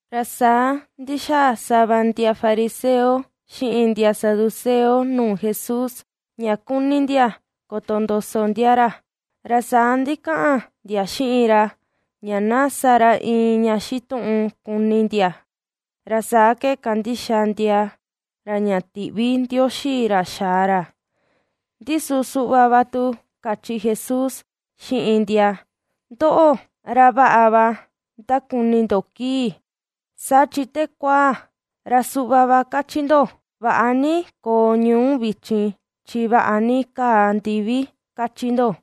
Ra saa ndixaa sava ndia fariseo xiꞌin ndia saduceo nuu Jesús, ña kuni ndia kotondoso ndia ra, ra saa ndikaꞌan ndia xiꞌin ra, ña na sa ra iin ña xituꞌun kuni ndia, ra saa ke kandixa ndia ra ña tiꞌvi Ndioxi ra xaa ra. Ndi su suꞌva va tu kachi Jesús xiꞌin ndia: ―Ndoꞌo, ra vaꞌa va ndakuni ndo kii, saa chi te kuaa, ra suꞌva va kachi ndo: “Vaꞌa ni koo ñuu vichin chi vaꞌa ni kaa ndivi”, kachi ndo.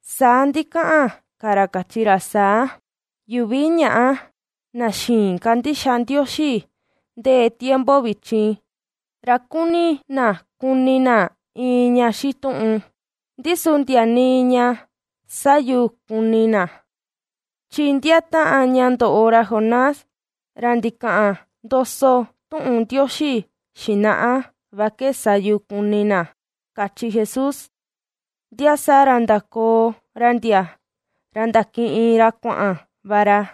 Saa ndikaꞌan ka ra kachi ra saa: ―Yuvi ñaꞌa, na xïin kandixa Ndioxi ndee tiempo vichin, ra kuni na kuni na iin ña xituꞌun, ndi su ndia nii ña sä yu kuni na, chi ndia taꞌan ña ndoꞌo ra Jonás, ra ndikaꞌan ndoso tuꞌun Ndioxi xinaꞌa va ke sa yu kuni na ―kachi Jesús. Ndia saa ra ndakoo ra ndia, ra ndakiꞌin ra kuaꞌan va ra.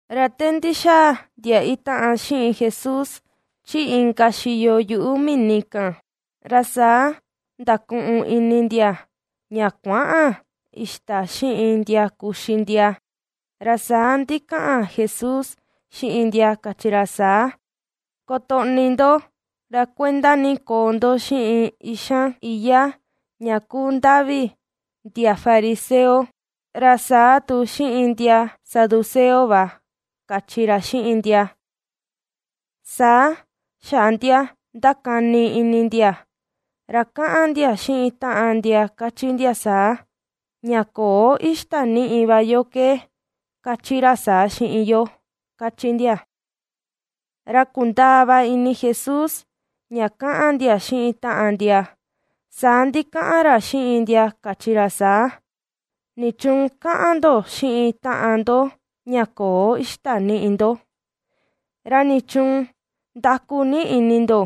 Ra te ndixaa ndia itaꞌan xiꞌin Jesús, chi inka xiyo yuꞌu mini kan, ra saa ndakuꞌun ini ndia ña kuäꞌan ixta xiꞌin ndia kuxi ndia. Ra saa ndikaꞌan Jesús xiꞌin ndia kachi ra saa: ―Kotoꞌni ndo, ra kuenda ni koo ndo xiꞌin ixan iyá ña kuu ndavi ndia fariseo, ra saa tu xiꞌin ndia saduceo va ―kachi ra xiꞌin ndia. Saa xaꞌa ndia ^ndakani ini ndia, ra kaꞌan ndia xiꞌin taꞌan ndia kachi ndia saa: ―Ña köo ixta niꞌi va yo ke, kachi ra saa xiꞌin yo ―kachi ndia. Ra kundaa va ini Jesús ña ^kaꞌan ndia xiꞌin taꞌan ndia, saa ndikaꞌan ra xiꞌin ndia kachi ra saa: ―¿Nichuun kaꞌan ndo xiꞌin taꞌan ndo ña köo ixta niꞌi ndo? ¡Ra nichuun ndaku ni ini ndo,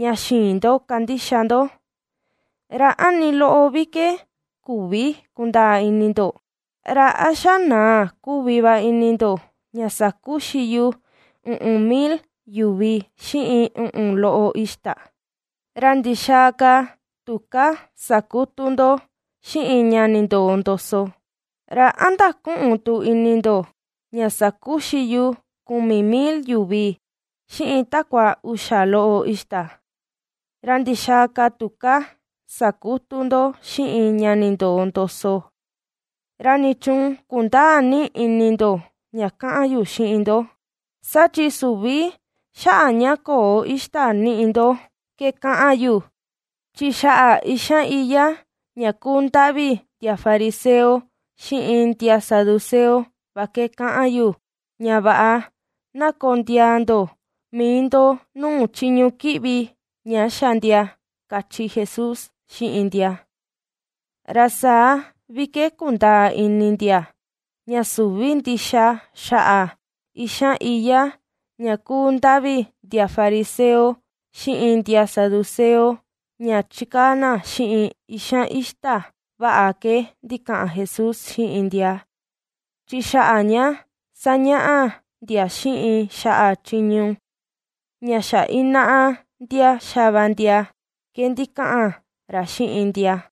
ña xïin ndo kandixa ndo! ¿Ra a nii loꞌo vi ke küvi kundaa ini ndo? ¿Ra a xa naa kuvi va ini ndo ña sakuxi yu uꞌun mil yuvi, xiꞌin uꞌun loꞌo ixta? ¿Ra ndixaa ka tuká sakutu ndo xiꞌin ña nindoo ndoso? ¿Ra a ndaküꞌun tu ini ndo ña sakuxi yu kumi mil yuvi, xiꞌin takua uxa loꞌo ixta? ¿Ra ndixaa ka tuká sakutu ndo xiꞌin ña nindoo ndoso? ¿Ra nichuun kundäa ni ini ndo ña kaꞌan yu xiꞌin ndo? Saa chi süvi xaꞌa ña köo ixta niꞌi ndo ke kaꞌan yu, chi xaꞌa ixan iyá ña kuu ndavi ndia fariseo xiꞌin ndia saduceo va ke kaꞌan yu, ña vaꞌa na kondiaa ndo mii ndo nuu chiñu kiꞌvi ña xa ndia ―kachi Jesús xiꞌin ndia. Ra saa vi ke kundaa ini ndia, ña süvi ndixa xaꞌa ixan iyá ña kuu ndavi ndia fariseo xiꞌin ndia saduceo, ña chikaa na xiꞌin ixan ixta vaꞌa ke ndikaꞌan Jesús xiꞌin ndia, chi xaꞌa ña ^sañaꞌa ndia xiꞌin xaꞌa chiñu ña xa inaꞌa ndia xa va ndia ke ndikaꞌan ra xiꞌin ndia.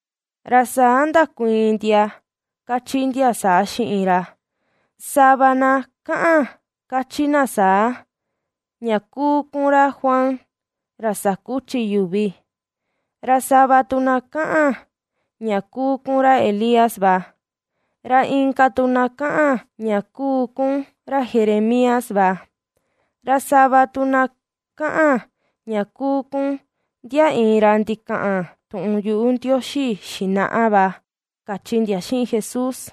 Ra saa ndakuiin ndia kachi ndia saa xiꞌin ra: ―Sava na kaꞌan kachi na saa, ña kuu kun ra Juan ra sakuchi yuvi; ra sava tu na kaꞌan ña kuu kun ra Elías va; ra inka tu na kaꞌan ña kuu kun ra Jeremías va; ra sava tu na kaꞌan ña kuu kun ndia iin ra ndikaꞌan tuꞌun yuꞌu Ndioxi xinaꞌa va ―kachi ndia xiꞌin Jesús.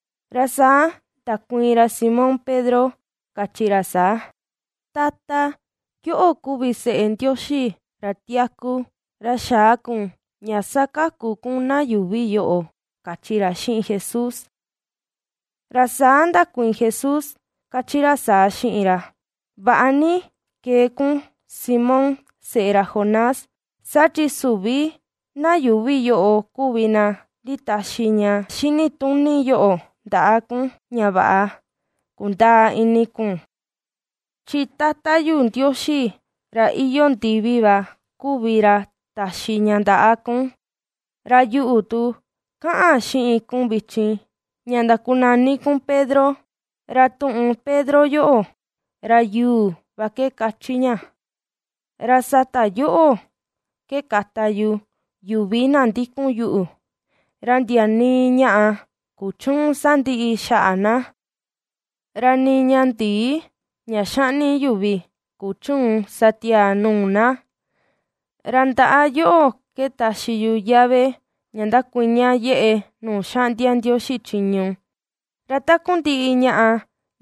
Ra saa ndakuiin ra Simón Pedro kachi ra saa: ―Tata, yoꞌo kuvi seꞌe Ndioxi ra tiaku, ra xa̱à kun ña sakaku na yuuvi yoꞌo ―kachi ra xiꞌin Jesús. Ra saa ndakuiin Jesús kachi ra saa xiꞌin ra: ―Vaꞌa ni ^kee kun, Simón, seꞌe ra Jonás, saa chi süvi na yuuvi yoꞌo kuvi na nditaxi ña xinituni yoꞌo ndaꞌa kun, ña vaꞌa kundaa ini kun, chi Tata yu Ndioxi ra iyoo ndivi va kuvi ra taxi ña ndaꞌa kun. Ra yuꞌu tu, kaꞌan xiꞌin kun vichin, ña ndakunani kun Pedro. Ra tuꞌun “Pedro” yoꞌo, ra “yuu” va ke kachi ña. Ra sata yoꞌo ke kata yu yuvi na ndikun yuꞌu, ra ndia nii ñaꞌa kuchüun sandiꞌi xaꞌa na, ra nii ña ndii ña xaꞌni yuvi kuchüun sa tiaa nuu na. Ra ndaꞌa yoꞌo ke taxi yu yave, ña ndakuiña yeꞌe nuu xaꞌndia Ndioxi chiñu. Ra takundiꞌi ñaꞌa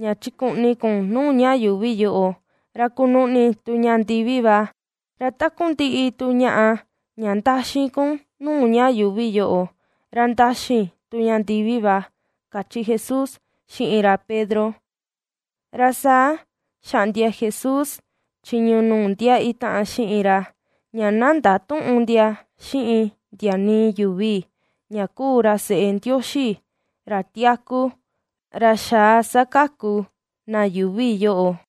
ña chikuꞌni kun nuu ña yuuvi yoꞌo, ra kunuꞌni tu ña ndivi va, ra takundiꞌi tu ñaꞌa ña ndaxi kun nuu ña yuuvi yoꞌo, ra ndaxi tu ña ndivi va ―kachi Jesús xiꞌin ra Pedro. Ra saa xaꞌndia Jesús chiñu nuu ndia itaꞌan xiꞌin ra, ña na ndatüꞌun ndia xiꞌin ndia nii yuvi, ña kuu ra seꞌe Ndioxi, ra tiaku, ra ^xaa sakaku na yuuvi yoꞌo.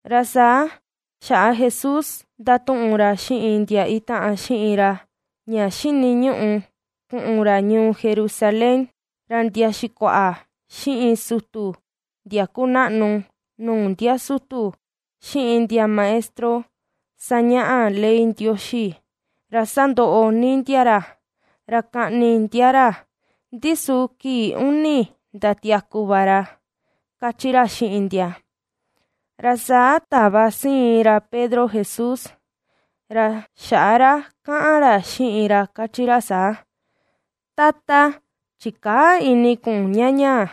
Ra saa xaꞌa Jesús ndatuꞌun ra xiꞌin ndia itaꞌan xiꞌin ra, ña xiniñuꞌu kuꞌun ra ñuu Jerusalén, ra ndia xikuaꞌa, xiꞌin sutu ndia kunaꞌnu nuu ndia sutu, xiꞌin ndia maestro sañaꞌa ley Ndioxi, ra sandoꞌo ni ndia ra, ra kaꞌni ndia ra, ndi su kii uni ndatiaku va ra ―kachi ra xiꞌin ndia. Ra saa tava siin ra Pedro Jesús, ra xaꞌa ra kaꞌan ra xiꞌin ra kachi ra saa: ―Tata, ¡chikäa ini kun ña ñaa,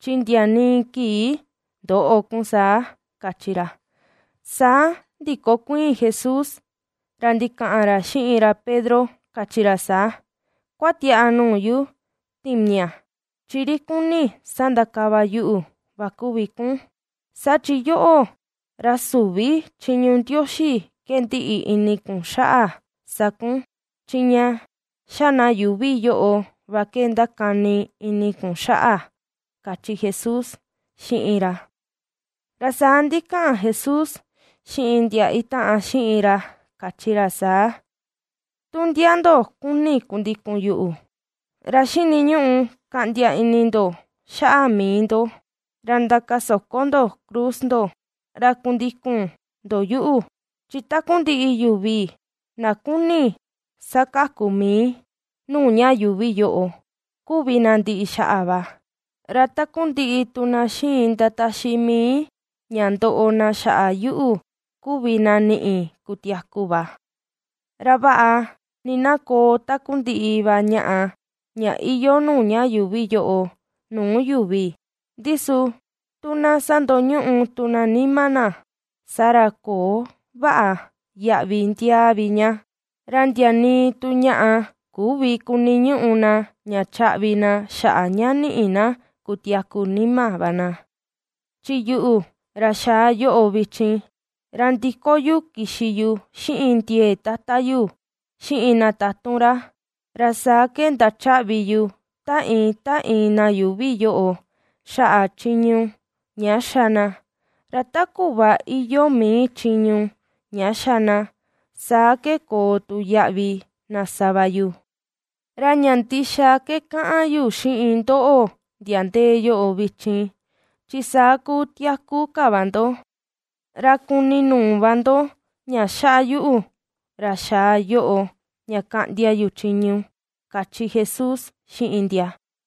chi ndia nii kii ndöꞌo kun saa! ―kachi ra. Saa ndikokuiin Jesús, ra ndikaꞌan ra xiꞌin ra Pedro kachi ra saa: ―¡Kuatiaꞌa nuu yu, timiaꞌa!, chi ri kuni sandakava yuꞌu va kuvi kun, saa chi yoꞌo, ra süvi chiñu Ndioxi ke ndiꞌi ini kun xaꞌa sa kun, chi ña xa na yuuvi yoꞌo va ke ndakani ini kun xaꞌa ―kachi Jesús xiꞌin ra. Ra saa ndikaꞌan Jesús xiꞌin ndia itaꞌan xiꞌin ra kachi ra saa: ―Tu ndia ndo kuni kundikun yuꞌu, ra xiniñuꞌu ^kaꞌndia ini ndo xaꞌa mii ndo, ra ndakasoko ndo cruz ndo ra kundikun ndo yuꞌu. Chi takundiꞌi yuvi, na kuni sakaku mii nuu ña yuuvi yoꞌo, kuvi na ndiꞌi xaꞌa va, ra takundiꞌi tu na xiin ndataxi mii ña ndoꞌo na xaꞌa yuꞌu, kuvi na niꞌi kutiaku va. Ra vaꞌa ni na koo takundiꞌi va ñaꞌa ña iyoo nuu ña yuuvi yoꞌo nuu yuvi, ndi su tu na sandoñuꞌu tu na nima na, saa ra köo vaꞌa yaꞌvi ndiaa vi ña. Ra ndia nii tu ñaꞌa küvi kuniñuꞌu na ña chaꞌvi na xaꞌa ña niꞌi na kutiaku nima va na. Chi yuꞌu, ra xaa yoꞌo vichin, ra ndiko yu kixi yu xiꞌin ndiee Tata yu, xiꞌin na tatun ra, ra saa ke ndachaꞌvi yu ta iin ta iin na yuuvi yoꞌo xaꞌa chiñu ña ^xa na, ra ta kuꞌva iyoo mii chiñu ña ^xa na, saa ke koo tu yaꞌvi na sa va yu. Ra ña ndixa ke kaꞌan yu xiꞌin ndoꞌo, ndia ndee yoꞌo vichin, chi saa kúú tiaku ka va ndo, ra kuni nuu va ndo ña xaꞌa yuꞌu, ra xaa yoꞌo ña kaꞌndia yu chiñu ―kachi Jesús xiꞌin ndia.